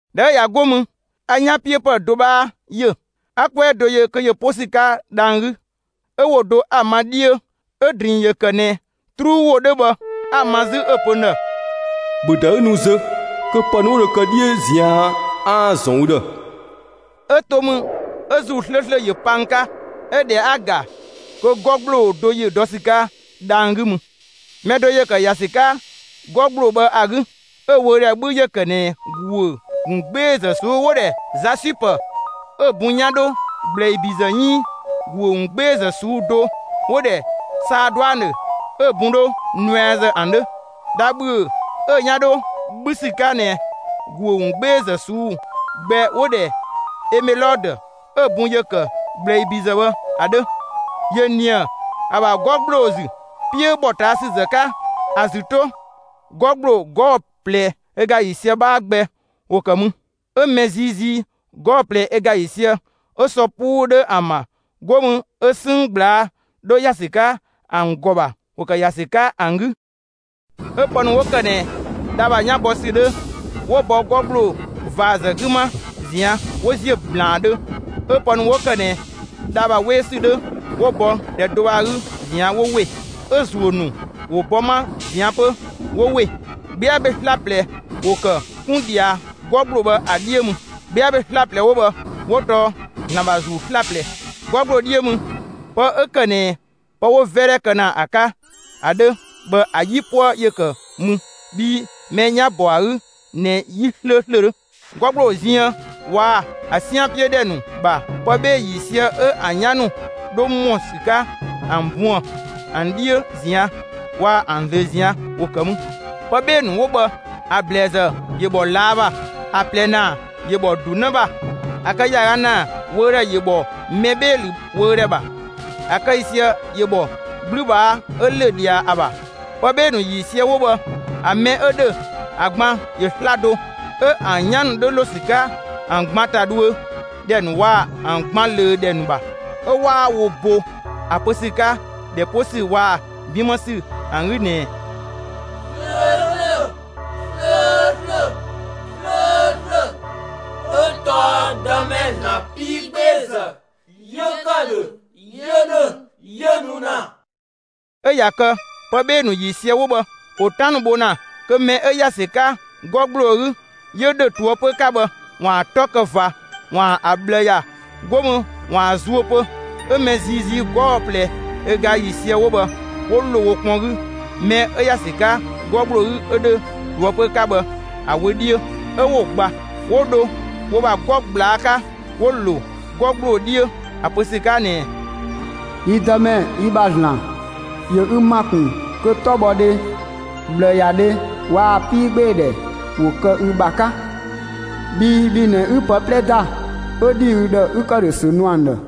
꞊Dhɛ 'ö ꞊ya 'go mü a 'yanpiöpë do 'bhaa ‑yö. 'A 'kwɛɛ do yö, kö ‑yö 'po ‑sü 'ka dhang‑ 'gü; 'ö ‑wo do 'a‑ ma 'dhiö 'ö‑ ‑drinng ‑yö ‑kë ꞊nɛ 'truu ‑wo 'dhö bhë, 'a‑ ma 'zü 'ö‑ pö n ‑dhë: «‑Bhö ‑da 'ü nu zö kö pë ‑nu 'wo dho kë 'dhiö ꞊zian' 'aan‑ ‑zɔn ü ‑dhë!» 'Ö to mü 'ö ‑Zuu 'slööslö ‑yö pa n 'ka. 'Ö ꞊dhɛ 'a‑ ‑ga kö 'gɔ ‑gbloo do ‑yö dɔ ‑sü 'ka dhang‑ 'gü mü. Mɛ do ‑yö ‑kë ‑ya ‑sü 'ka 'gɔ ‑gbloo bhë ‑a 'gü; 'ö‑ wöödhɛ 'bhü ‑yö ‑kë ꞊nɛ ‑guö ‑wungbeezë ꞊suu'‑ 'wo‑ ‑dhɛ 'zasüpë 'ö‑ bun 'yan dho ‑gblɛibizë 'iin ‑guö ‑wungbeezë ꞊suu'‑ do 'wo‑ ‑dhɛ 'saaduanö 'ö‑ bun dho nuɛazë ‑an 'dhö. Dha ‑bhüö 'ö‑ 'yan 'dho 'bhü ‑sü 'ka ꞊nɛ ‑guö ‑wungbeezë ꞊suu'‑ gbɛ 'wo‑ ‑dhɛ emelodö 'ö‑ bun ‑yö ‑kë ‑gblɛibizë bhë ‑a 'dhö, ‑yö ‑nië ‑a ‑bha 'gɔ ‑gbloo ‑zü. 'Piö ‑bhɔ ꞊taa' ‑sü ‑zë 'ka ‑a ‑zü 'to, 'gɔ ‑gbloo 'gɔɔ‑ ꞊plɛ ö ga ‑yiisië 'bhaa gbɛ ‑wo ‑kë mü. 'Ö mɛ ziizii 'gɔɔ‑ ꞊plɛ ö ga ‑yiisië 'ö sɔ 'puu 'dhö ‑an ‑bha, 'go mü 'ö 'sënng ꞊gblaa' 'dho ‑ya ‑sü 'ka ‑an ‑gɔ ‑bha ‑wo ‑kë ‑ya ‑sü 'ka ‑an 'gü. 'Ö pë ‑nu 'wo ‑kë ꞊nɛ dha ‑bha 'yan bɔ ‑sü 'dhö ‑wo bɔ 'gɔ ‑gbloo ꞊vaazë 'gü 'ma ꞊zian' 'wo ‑ziö ‑blaandhö, 'ö pë ‑nu 'wo ‑kë ꞊nɛ dha ‑bha 'we ‑sü 'dhö 'wo bɔ ‑dhɛ do bhë ‑a 'gü ꞊zian' 'wo ‑we. 'Ö ‑zuö ‑nu ‑wo bɔ 'ma ꞊zian' 'pö 'wo ‑we. 'Gbia ‑be 'slaplɛ ‑wo ‑kë 'kun ꞊dhia 'gɔ ‑gbloo bhë ‑a 'dhiö mü. 'Gbia ‑be 'slaplɛ 'wo bhë 'wo tɔɔ ‑Zlan ‑bha ‑Zuu 'slaplɛ. 'Gɔ ‑gbloo 'dhiö mü, pë 'ö ‑kë ꞊nɛ pë 'wo‑ 'vɛdhɛ kë ‑na ‑a 'ka ‑a 'dhö bhë, ‑a 'yipuë ‑yö ‑kë mü, bhii mɛ 'yan‑ ‑bɔ ‑a 'gü ꞊nɛ 'yi 'slööslö 'dhö. 'Gɔ ‑gbloo ziën waa‑ ‑a 'sian 'piö ‑dhɛ ‑nu ‑bha, pë 'bhee‑ ‑yiisië 'ö ‑an 'yan ‑nu 'dho ‑mɔ ‑sü 'ka ‑an buën‑ ‑an 'dhiö ꞊zian' waa‑ ‑an ꞊zlöö ꞊zian' ‑wo ‑kë mü. Pë 'bhee‑ ‑nu 'wo bhë ‑a ‑blɛɛzë ‑yö ‑bhɔ ꞊laa' ‑bha; ‑a ꞊plɛ ‑naa ‑yö bhɔ ‑du 'në ‑bha; a‑ kë ‑yaaga ‑naa wöödhɛ ‑yö bhɔ mɛ 'bhee‑ ‑lü wöödhɛ ‑bha, 'ö‑ kë ‑yiisië ‑yö bhɔ 'gblübhaa 'ö ‑lö ꞊dhia ‑a ‑bha. Pë 'bhee‑ ‑nu ‑yiisië 'wo bhë, ‑a mɛ 'ö ‑dhö ‑a gban ‑yö 'slado; 'ö ‑an 'yan ‑nu 'dhö ‑lo ‑sü 'ka ‑an gban ‑ta dhuö ‑dhɛ ‑nu waa‑ ‑an gban ꞊löö ‑dhɛ ‑nu ‑bha. 'Ö 'waa wo bo ‑a pö ‑sü 'ka ‑dhɛ 'po ‑sü waa‑ 'bin 'më ‑sü ‑an 'gü ꞊nɛɛ: «'Slööslö, 'slööslö, 'slööslö 'yö tɔɔ Dëmɛ ‑Zlan 'piigbeezë 'yö ‑kë ‑dhö, 'yö ‑dhö, 'yö nu ‑na.» 'Ö ꞊ya kë pë 'bhee‑ ‑nu ‑yiisië 'wo bhë ‑wo 'tan ‑nu bho ‑na kö mɛ 'ö ‑ya ‑sü 'ka 'gɔ ‑gbloo 'gü, 'yö ‑dhö ꞊toëpö 'ka bhë ‑waan 'tɔ kë ꞊va, ‑waan ‑a ꞊bhlë ‑ya, 'go mü ‑waan zuö pö, 'Ö mɛ ziizii 'gɔɔ‑ ꞊plɛ ö ga ‑yiisië 'wo bhë 'wo ‑lo wo kpɔn 'gü, mɛ 'ö ‑ya ‑sü 'ka 'gɔ ‑gbloo 'gü 'ö ‑dhö ꞊toëpö 'ka bhë ‑a wö 'dhiö 'ö 'wo‑ gba. 'Wo dho wo ‑bha 'gɔ ꞊gblaa' 'ka 'wo‑ ‑lo 'gɔ ‑gbloo 'dhiö ‑a pö ‑sü 'ka ꞊nɛɛ: «Yi Dëmɛ, yi ‑bha ‑Zlan, ‑yö ü ‑ma ‑kun kö 'tɔbhɔdhe, ꞊bhlëyadhe waa‑ 'piigbeedhɛ ‑wo kë ü ‑bha 'ka; bhii bhi ꞊nɛ 'ü pë 'plɛ ‑da, 'ö ‑dhi ü ‑dhë 'ü ‑këdhösü nu ‑an ‑dhë.»